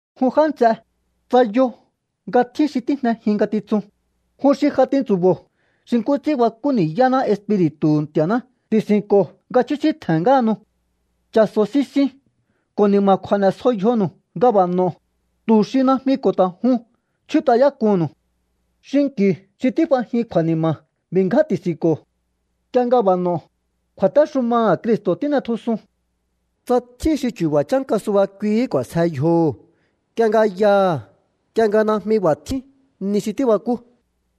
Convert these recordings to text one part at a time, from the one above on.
Jun já nts'e, tsa yo nga tjín xi tíjnejin ngatitsun, jun xi ja tintsu̱bo̱o xi nkú ts'ín bakú ni̱yáná Espiri̱tu̱hu̱ Nti̱a̱ná ti̱si̱nko̱o nga chjúsíntje̱n ngáhanu. Cha̱so̱ sisiun ko̱ ni̱ma̱kju̱a̱ n'e̱sjo yjonu̱u nga b'a̱ n'o̱o, tu̱ xi najmi ko̱ ta̱ jun chjút'ayák'uhu̱nnu̱u. Xinki̱u xi tíf'ajin kju̱a̱ni̱ma̱ b'i̱ ngján ti̱si̱nko̱o. Nk'ie nga b'a̱ n'o̱o, kju̱a̱téxumaha̱ Cristo̱ tín'etjusun. Tsa tjín xi chu̱ba̱ chánka suba kuihí k'u̱a̱sje yjoho̱ nk'ie nga yaha̱ nk'ie nga najmi b'a̱ tjín ni xi tíbakú,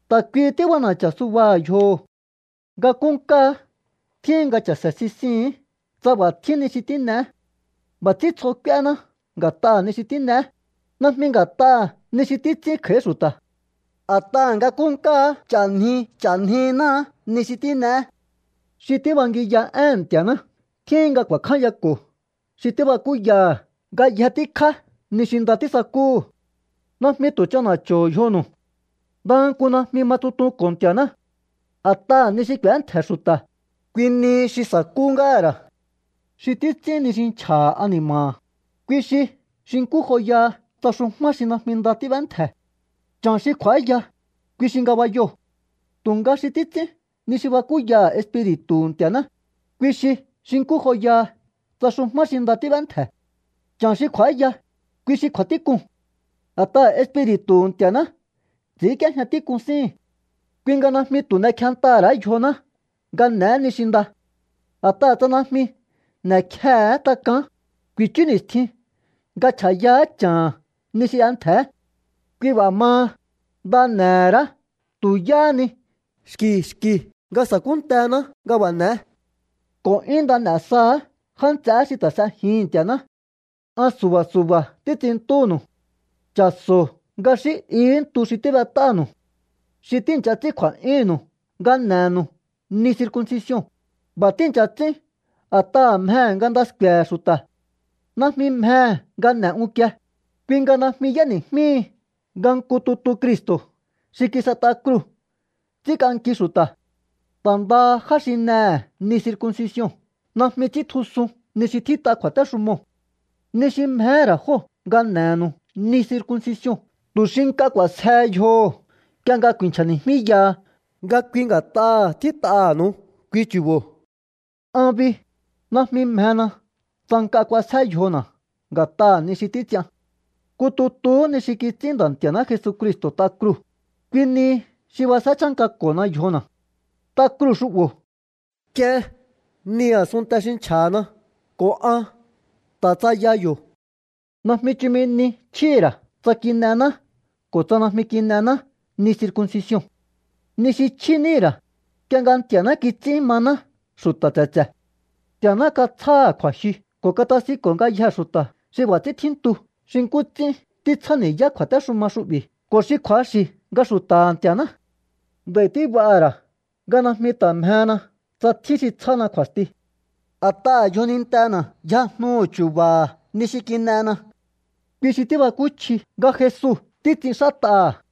ta̱ kuihi tíb'ana̱cha̱ subaha̱ yjoho̱. Nga nkúnkáá tjíhin nga cha̱se̱ sisihi̱ín tsa b'a̱ tjín ni xi tín'eé. B'a̱ ts'ín tsjo k'úéhená nga̱t'aha̱ ni xi tín'eé, najmi nga̱t'aha̱ ni xi títs'ín kj'a̱í xu̱ta̱. A̱t'aha̱ nga nkúnkáá ch'a̱nji ch'a̱njináá ni xi tín'eé. Xi tíbangiya éhe̱n Nti̱a̱ná tjíhin nga ku̱a̱kjányako̱ xi tíbakúyaha̱ ngayje tíkjá ni xi nda tísakúhu̱. Najmi tu̱ ch'ana̱cho̱o yjonu̱u. Ndaha nku najmi ma tsutonko̱ Nti̱a̱ná. A̱t'aha̱ ni xi k'u̱éntje̱ xu̱ta̱, kui nihi xi sa̱kú ngáha̱ ra̱. Xi títs'ín ni xi nchja̱ha̱ ani̱ma̱ha̱, kui xi xi nkú joyaha tsa xujmá xi najmi nda tíb'éntje̱. Cha̱n xi kj'u̱áya, kui xi ngabayoo̱. Tu̱nga xi títs'ín ni xi bakúyaha̱ Espiri̱tu̱hu̱ Nti̱a̱ná, kui xi xi nkú joyaha tsa xujmá xi nda tíb'éntje̱. Cha̱n xi kj'u̱áya, kui xi kju̱a̱tík'uu̱n. A̱t'aha̱ Espiri̱tu̱hu̱ Nti̱a̱ná ts'i̱ínk'íéjña tík'un síhi̱n. Kui nga najmi tu̱ n'ekjentaha̱ ra̱á yjoná nga n'e̱é ni xi nda. A̱t'aha̱ tsa najmi n'e̱kjehe̱é tak'aán, ku̱i̱chú ni̱stjin nga chj'a̱yaá cha̱ha̱n ni xi y'entje̱é. Kui b'a̱ maha, nda n'e̱he̱ ra̱á tu̱ yáhá ni xki̱ xki̱ nga sa̱kúntená nga b'a̱ n'e̱é. Ko̱ 'yún nda n'e̱ saha̱á já nts'eé xi ta̱ s'ejihi̱n Nti̱a̱ná. An su̱ba̱ su̱ba̱ títs'inntúnu̱u. Cha̱so̱o nga xí ihí ntu xi tíb'et'ánu̱u. Xi tíi̱ncha ts'ín kju̱a̱'yúhu̱nnu̱u nga n'e̱nu̱u ni circuncision, b'a̱ tíi̱ncha ts'ín a̱t'aha̱ mjehe̱ nga nda sku̱e̱he̱ xu̱ta̱. Najmi mjehe̱ nga n'e̱ unkie, kui nga najmi y'éni̱jmíhi nga nku tutu Cristo̱ xi kis'et'a kruu̱ ts'ínk'anki xu̱ta̱. Ta̱ ndaha já xi n'ehe̱ ni circuncision najmi ts'íntjusun ni xi tjít'a kju̱a̱téxumoo̱. Ni xi mjehé ra̱ jóo̱ nga n'e̱nu̱u ni circuncision tu̱ xi nk'a k'u̱a̱sjehe yjoho̱ nk'ie nga ku̱i̱nchja̱ni̱jmíyaha nga kui nga̱t'aha̱ tjít'aha̱nu̱u kui chu̱bo̱. An bi, najmi mjena tsa nk'a k'uasjé yjona̱ nga̱t'aha̱ ni xi títs'ian. Nku tutuhú ni xi kits'ín Nda̱ Nti̱a̱ná Jesucristo̱ t'a kruu̱, kui nihi xi b'asjé chánkako̱hona yjona̱. T'a kruu̱ xu'bo̱ k'ien ni a̱sunnte xi nchja̱na ko̱ an ta̱ tsaya yo̱. Najmi chumi ni chjíhi̱ ra̱ tsa kin'ená ko̱ tsa najmi kin'ená ni circuncision. Ni xi chjí níhi̱ ra̱, nk'ie nga Nti̱a̱ná kits'ín maná xu̱ta̱ tse̱tse̱. Nti̱a̱ná katsjáha̱ kju̱a̱jyu ko̱ katasinko̱ ngayjee̱ xu̱ta̱ xi b'a̱ ts'ín tjíntu xi nkú ts'ín títsjáni̱yá kju̱a̱téxuma xu'bi̱ ko̱ xi kju̱axi̱ nga xu̱ta̱ha̱ Nti̱a̱ná. Nd'a̱i̱ tíb'aha̱ ra̱ nga najmi ta̱ mjehena tsa tjín xi tsjána kju̱a̱sti. A̱t'aha̱ yjonintena̱ yjajnu chu̱ba̱ha̱ ni xi kin'ena. Kui xi tíbakúchji nga Jesu títs'inxát'aha̱.